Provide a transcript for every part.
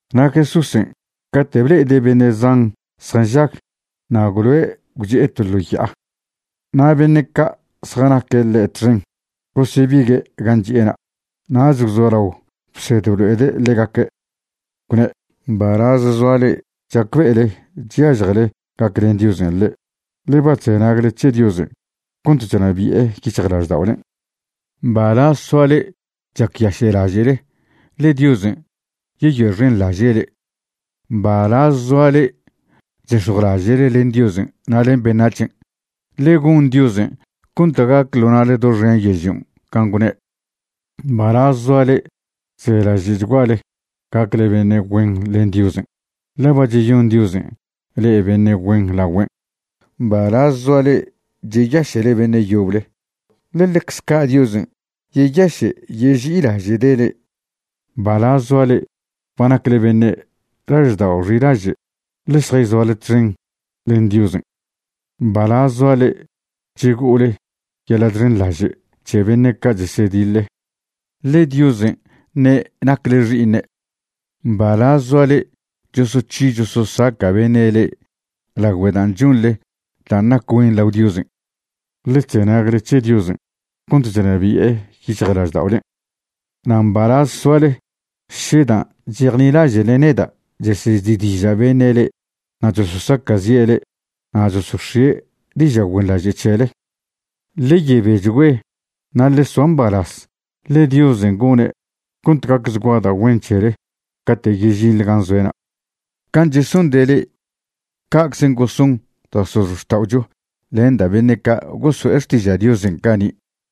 Na' Jesúsen' cate' ble'ede' beṉe' zan zjanžag, na' gwloe' gwchi'e to ḻo ya'a. Na' beṉe' ca' zjanaque' ḻe' txen gosebigue' gan' chi'ena'. Nach gwzolao bsed blo'ede' ḻegaque', gwne': ―Mbalaz zoa le'e chacbe'ele chyažjele gaclen Diosen' le'e, ḻe ba chzenagle c̱he Diosen' cont chnabi'e yic̱hjlažda'olen'. ’Mbalaz soa le'e chacyaše'laže'le, ḻe Diosen' yeyoe'xenḻaže' le'e. ’Mbalaz zoa le'e chzex̱jwlaže'le len Diosen' na' len beṉac̱hen', ḻe gon Diosen' cont gac ḻo na'le doxen yežlion' can' gwne'. ’Mbalaz zoa le'e chzelaže'chguale gacle beṉe' güen len Diosen', ḻe ba cheyon Diosen' le'e beṉe' güen lagüen'. ’Mbalaz zoa le'e cheyaše'le beṉe' yoble, ḻe ḻecze ca' Diosen' yeyaše' yeži'ilaže'de' le'e. ’Mbalaz zoa le'e ba nacle beṉe' laždao' xilaže', ḻe šjayzoale txen len Diosen'. ’Mbalaz zoa le'e chego'ole yeḻa' chxenḻaže' c̱he beṉe' chesediḻe, ḻe Diosen' ṉe' nacle xi'iṉe'. ’Mbalaz zoa le'e chosoc̱hi chososaca' beṉe' le'e lagüe dan' chonḻe dan' nac güen lao Diosen', ḻe chzenagle c̱he Diosen' cont chnabi'e yic̱hjlažda'olen'. ’Na' mbalaz soale še dan' chejnilaže'le neda' chesezi'diža' beṉe' le'e na' chososaca'zi'e le'e na' chosox̱ie' diža' güenḻaže' c̱hele. Ḻe yebechgüe na' ḻe soa mbalaz, ḻe Diosen' gone' cont gacchgua da' güen c̱hele cate' yežinḻe gan' zoe'na'. Can' chesonde' le'e, ca'czen' goson da' x̱ozxta'ocho len da' beṉe' ca' goso'e xtiža' Diosen' cani'.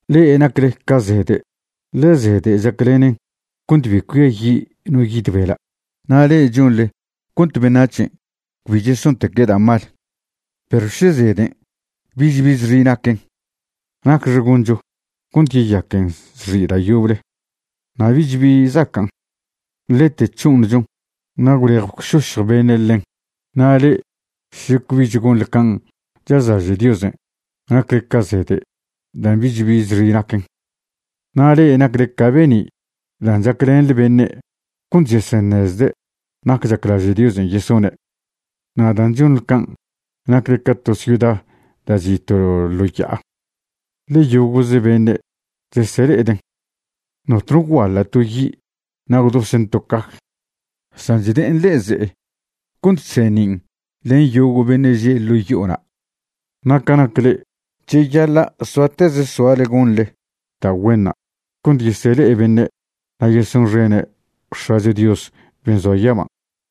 ’Le'e nacle ca zede', ḻe zede' chaclenen cont bi cuiayi' no yid bela', na' le'e chonḻe cont beṉac̱hen' cbi chesonteque' da' mal. Perw še zeden' bich bi zxi' naquen, ¿nacxe goncho cont yeyaquen zxi' da' yoble? Na' bich bi zacan', ḻete c̱ho'oṉchon na' gwlej gwšošj beṉe' ḻen. Na' le'e še cbich gonḻe can' chazlaže' Diosen', nacle ca zede' dan' bich bi zxi' naquen. ’Na' le'e nacle ca be'ni' dan' chaclenḻe beṉe' cont cheseṉezde' nac chaclaže' Diosen' yesone'. Na' dan' chonḻe can', nacle ca to ciuda da' chi' to ḻo ya'a, ḻe yogo'ze beṉe' chesele'eden'. Notno gwguaḻa' to yi' na' gwdosen' to caj, san chde'en ḻe'e ze'e cont chseṉin' len yogo' beṉe' že' ḻo' yo'ona'. Na' ca nac le'e, cheyaḻa' soateze soale gonḻe da' güenṉa' cont yesele'e beṉe' na' yesonxene' X̱acho Dios ben' zoa yaban'.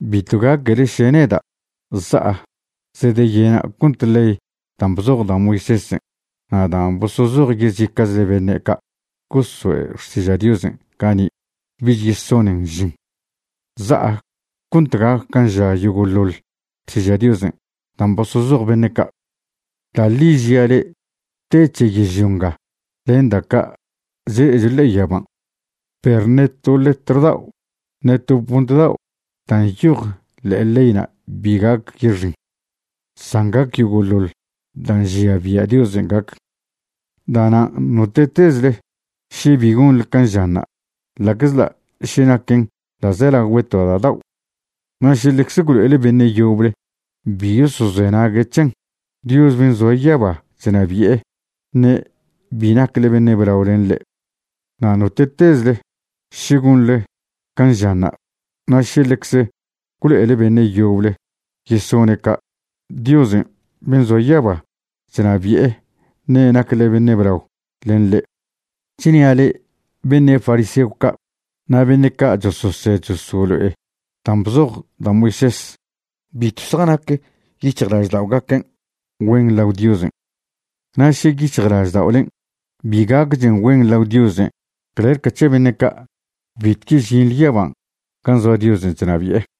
’Bitw gaquele še neda' za'a zedeyena' cont ley dan' bzoj da' Moisésen' na' dan' bosozoj yezica'chle beṉe' ca' goso'e xtiža' Diosen' cani' bich yesonen žin. Za'a cont gac can' ža yogo'ḻoḻ Xtiža' Diosen' dan' bosozoj beṉe' ca'. Da' ḻi žia' le'e, te c̱he yežlio nga len da' ca' chle'echo ḻe'e yaban', perw ṉe to letr dao' ṉe to punt dao' dan' nyoj ḻe'e leyna' bi gac yexin, san gac yogo'ḻoḻ dan' nžia bia' Diosen' gac. Da'nan' note'tezle še bi gonḻe can' žanṉa', la'czḻa' še naquen ḻa'zelagüe to da' dao', na' še ḻecze gwlo'ele beṉe' yoble bi yosozenague' c̱hen, Dios ben' zoa yaba chnabi'e ṉe' bi nacle beṉe' blao len ḻe'. Na' note'tezle še gonḻe can' žanṉa', na' še ḻecze gwlo'ele beṉe' yoble yesone' ca', Diosen' ben' zoa yaba chnabi'e ṉe' nacle beṉe' blao len ḻe'. Chnia' le'e, beṉe' fariseo ca' na' beṉe' ca' chososed chosolo'e dan' bzoj da' Moisés bitw zjanac yic̱hjlažda'ogaquen' güen lao Diosen'. Na' še yic̱hjlažda'olen' bi gacchen güen lao Diosen' clel ca c̱he beṉe' ca', bitw yežinḻe yaban' gan' zoa Diosen' chnabi'e.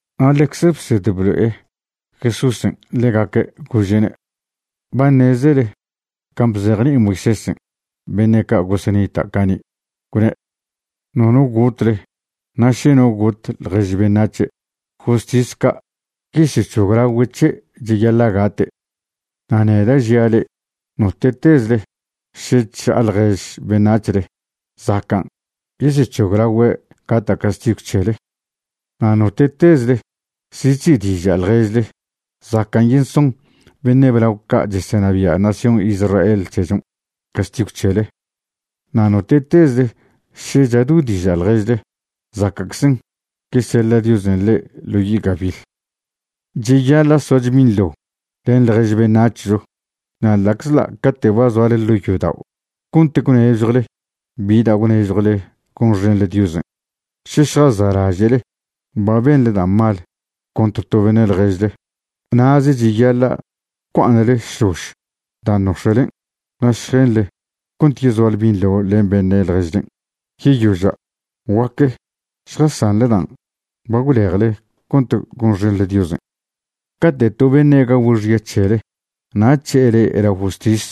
Na' ḻecze bsed blo'e Jesúsen' ḻegaque' gože'ne': ―Ba ṉezele can' bzejni'i Moisésen' beṉe' ca' gosenita' cani', gwne': “Nono gotle. Na' še no got ḻjež beṉac̱he', justis ca' yesec̱hoglagüe' c̱he' cheyaḻa' gate'.” Na' neda' žia' le'e, note'tezle še chža'a ḻjež beṉac̱hle, zacan' yesec̱hoglagüe' gata' castigw c̱hele. Na' note'tezle še chzi'diža' ḻježle, zacan' yesoṉ beṉe' blao ca' chesenabia' nación Israel c̱hechon' castigw c̱hele. Na' note'tezle še chado'diža' ḻježle, zaca'czen' yeseḻa' Diosen' le'e ḻo yi' gabiḻ. ’Cheyaḻa' soacho binḻo len ḻjež beṉac̱hcho. Na' ḻa'czḻa' cate' ba zoale ḻo' yodao' cont gwnežjwle bi dan' gwnežjwle gonxenḻe Diosen', še šjasa'laže'le ba benḻe da' mal contr to beṉe' ḻježle, na'ze cheyaḻa' gwcua'aṉle šlož dan' nox̱e'len' na' šjenḻe cont yezoale binḻo len beṉe' ḻježlen'. Yeyoža' guaque šjasanḻe dan' ba gwlejle cont gonxenḻe Diosen'. ’Cate' to beṉe' gagüe' xya c̱hele na' c̱he'e le'e lao justis,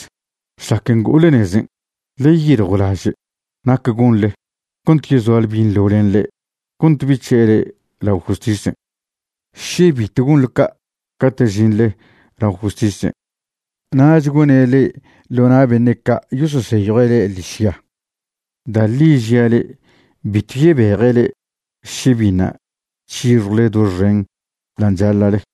šlac ngo'ole nezen' ḻe yeyiljwlaže' nac gonḻe cont yezoale binḻo len ḻe' cont bi c̱he'e le'e lao justisen'. Še bitw gonḻe ca', cate' žinḻe lao justisen', nach gone' le'e ḻo na' beṉe' ca' yososeyjue' le'e ḻižya. Da' ḻi žia' le'e, bitw yebeje' le'e še biṉa' c̱hixjwle doxen dan' chaḻa'le.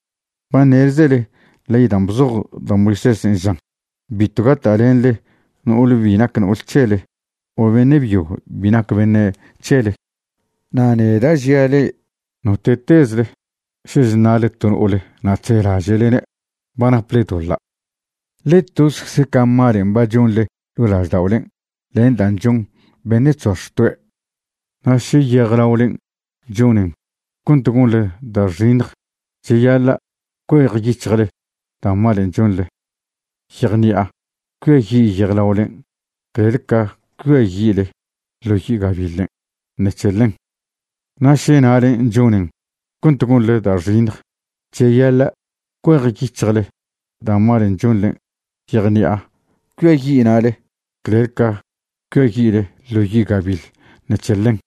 ’Ba ṉezele ley dan' bzoj da' Moisésen' žan: “Bitw gata'lenḻe no'ole bi nac no'ol c̱hele o beṉe' byo bi nac beṉe' c̱hele.” Na' neda' žia' le'e, note'tezle še chṉa'le to no'ole na' chzelaže'lene', ba naple doḻa'. Ḻe tozecze ca malen' ba chonḻe ḻo' lažda'olen' len dan' chon beṉe' chzoa xtoe'. ’Na' še yejlaolen' chonen cont gonḻe da' xiṉj, cheyaḻa' cuejyic̱hjle da' malen' chonḻe. Yejṉi'a cuiayi' yejlaolen' clel ca cuiayi'le ḻo yi' gabiḻen' ṉec̱he ḻen. Na' še na'le chonen cont gonḻe da' xiṉj, cheyaḻa' cuejyic̱hjle da' malen' chonḻe. Yejṉi'a cuiayi' na'le clel ca cuiayi'le ḻo yi' gabiḻ ṉec̱he ḻen.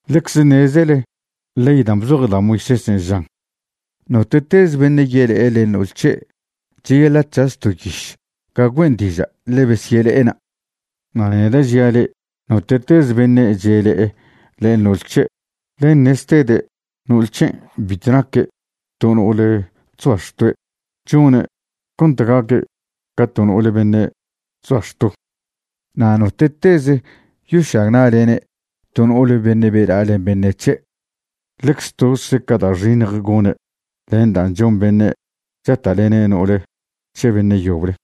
’Ḻecze ṉezele ley dan' bzoj da' Moisésen' žan: “Note'teze beṉe' yele'e len no'ol c̱he', cheyaḻa' c̱has to yiš ga güen' diža' ḻe besyele'ena'.” Na' neda' žia' le'e note'teze beṉe' chele'e len no'ol c̱he', ḻen ṉeztede' no'ole c̱hen' bitw naque' to no'ole chzoa xtoe', chone' cont gaque' ca to no'ole beṉe' chzoa xto. Na' note'teze yošagna'lene' to no'ole beṉe' bela'a len beṉe' c̱he', ḻecze tozcze ca da' xiṉj gone' len dan' chon beṉe' chata'lene' no'ol c̱he beṉe' yoble.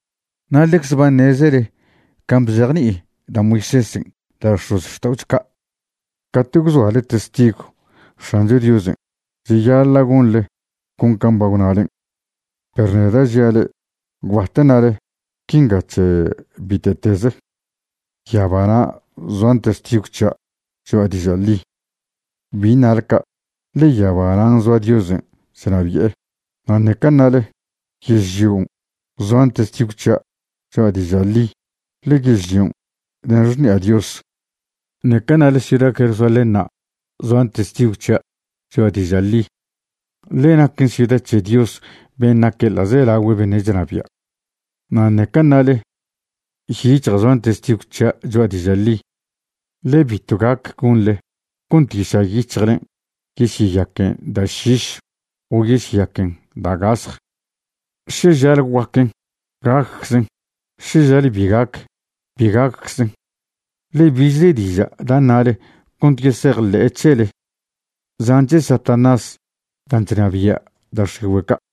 ’Na' ḻecze ba ṉezele can' bzejni'i da' Moisésen' da' x̱ozxta'ocho ca': “Cate' gwzoale testigw X̱ancho Diosen', cheyaḻa' gonḻe con can' ba gwnalen'.” Perw neda' žia' le'e gwbat ṉale quinga c̱he bite'teze: “Yabana' zoan testigw c̱hia' cho'a diža' ḻi”. Bi ṉale ca' ḻe yaba nan' zoa Diosen' chnabi'e. Na' ṉeca ṉale: “Yežlion' zoan testigw c̱hia' cho'a diža' ḻi”, ḻe yežlion' den xṉi'a Dios. Ṉeca ṉale: “Ciuda Jerusalénṉa' zoan testigw c̱hia' cho'a diža' ḻi”, ḻe naquen ciuda c̱he Dios ben' naque' ḻa'zelagüe beṉe' chnabia'. Na' ṉeca ṉale: “Yic̱hja' zoan testigw c̱hia' cho'a diža' ḻi”, ḻe bitw gac gonḻe cont yiša' yic̱hjlen' yesyeyaquen da' šiš o yesyeyaquen da' gasj. Še žale guaquen, gacczen; še žale bi gac, bi gacczen. Ḻe bichle diža' da' ṉale cont yesejḻe'e c̱hele, zan' c̱he Satanás dan' chnabia' da' x̱igüe' ca'.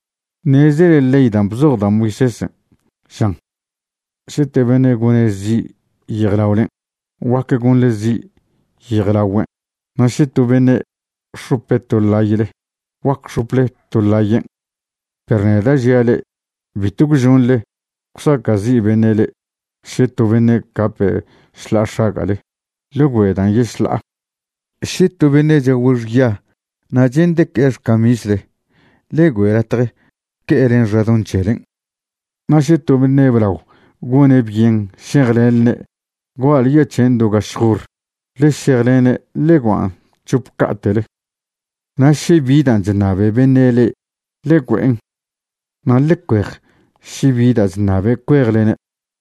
’Ṉezele ley dan' bzoj da' Moisésen' žan: “Še to beṉe' gone' zi' yejlaolen', guac gonḻe zi' yejlagüen', na' še to beṉe' x̱ope' to ḻayle, guac x̱ople to ḻayen'.” Perw neda' žia' le'e, bitw gwžonḻe gwsaca'zi' beṉe' le'e. Še to beṉe' cape' šḻa'a x̱aga'le, ḻe güe' dan' yešḻa'a. Še to beṉe' chagüe' xya na' che'nde' que'e xcamisle, ḻe güe' latje que'e len xadoṉ c̱helen'. Na' še to beṉe' blao gone' byen šejlenḻene' gua'le yoa' c̱hen' do gašj hor, ḻe šejlene' ḻe guan' c̱hop ca'te'le. Na' še bi dan' chṉabe beṉe' le'e, ḻe güen'. Na' ḻe cuej še bi da' chṉabe' cuejlene'.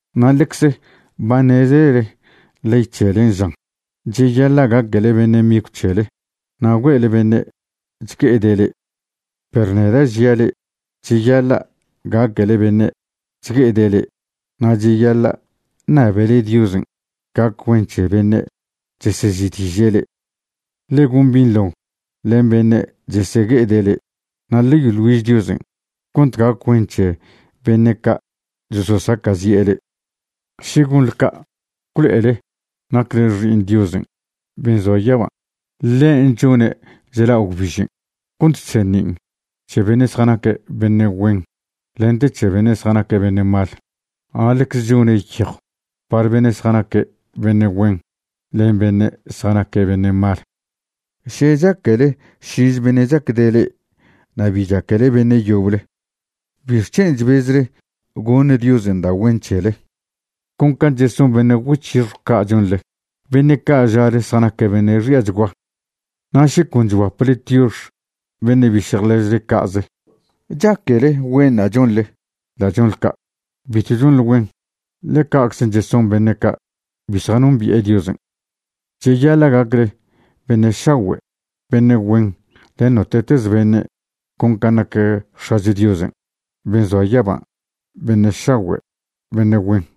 ’Na' ḻecze ba ṉezele ley c̱helen' žan: “Cheyaḻa' gaquele beṉe' migw c̱hele na' gue'ele beṉe' chgue'ede' le'e.” Perw neda' žia' le'e, cheyaḻa' gaquele beṉe' chgue'ede' le'e, na' cheyaḻa' ṉabele Diosen' gac güen c̱he beṉe' chesezi'diže' le'e. Ḻe gon binḻo len beṉe' chesegue'ede' le'e, na' ḻe yoḻ güiž Diosen' cont gac güen c̱he beṉe' ca' chososacazi'e le'e. Še gonḻe ca', gwlo'ele nacle xi'iṉ Diosen' ben' zoa yaban'. Ḻen' chone' chla' gwbižen' cont chseṉin' c̱he beṉe' zjanaque' beṉe' güen lente c̱he beṉe' zjanaque' beṉe' mal. Na' ḻecze chone' yejw par beṉe' zjanaque' beṉe' güen len beṉe' zjanaque' beṉe' mal. Še chaquele šinze beṉe' chacde' le'e na' bi chaquele beṉe' yoble ¿bixc̱hen' chbezle goṉ Diosen' da' güen c̱hele? Con can' cheson beṉe' güec̱hixjw ca' chonḻe, beṉe' ca' žale zjanaque' beṉe' xi'achgua. Na' še con chguaple tiox beṉe' biše' ḻježle ca'ze ¿chaquele güenṉa' chonḻe da' chonḻe ca'? Bitw chonḻe güen, ḻe ca'czen' cheson beṉe' ca' bi zjanombi'e Diosen'. Cheyaḻa' gacle beṉe' šagüe' beṉe' güen len note'teze beṉe' con can' nac X̱acho Diosen' ben' zoa yaban' beṉe' šagüe' beṉe' güen.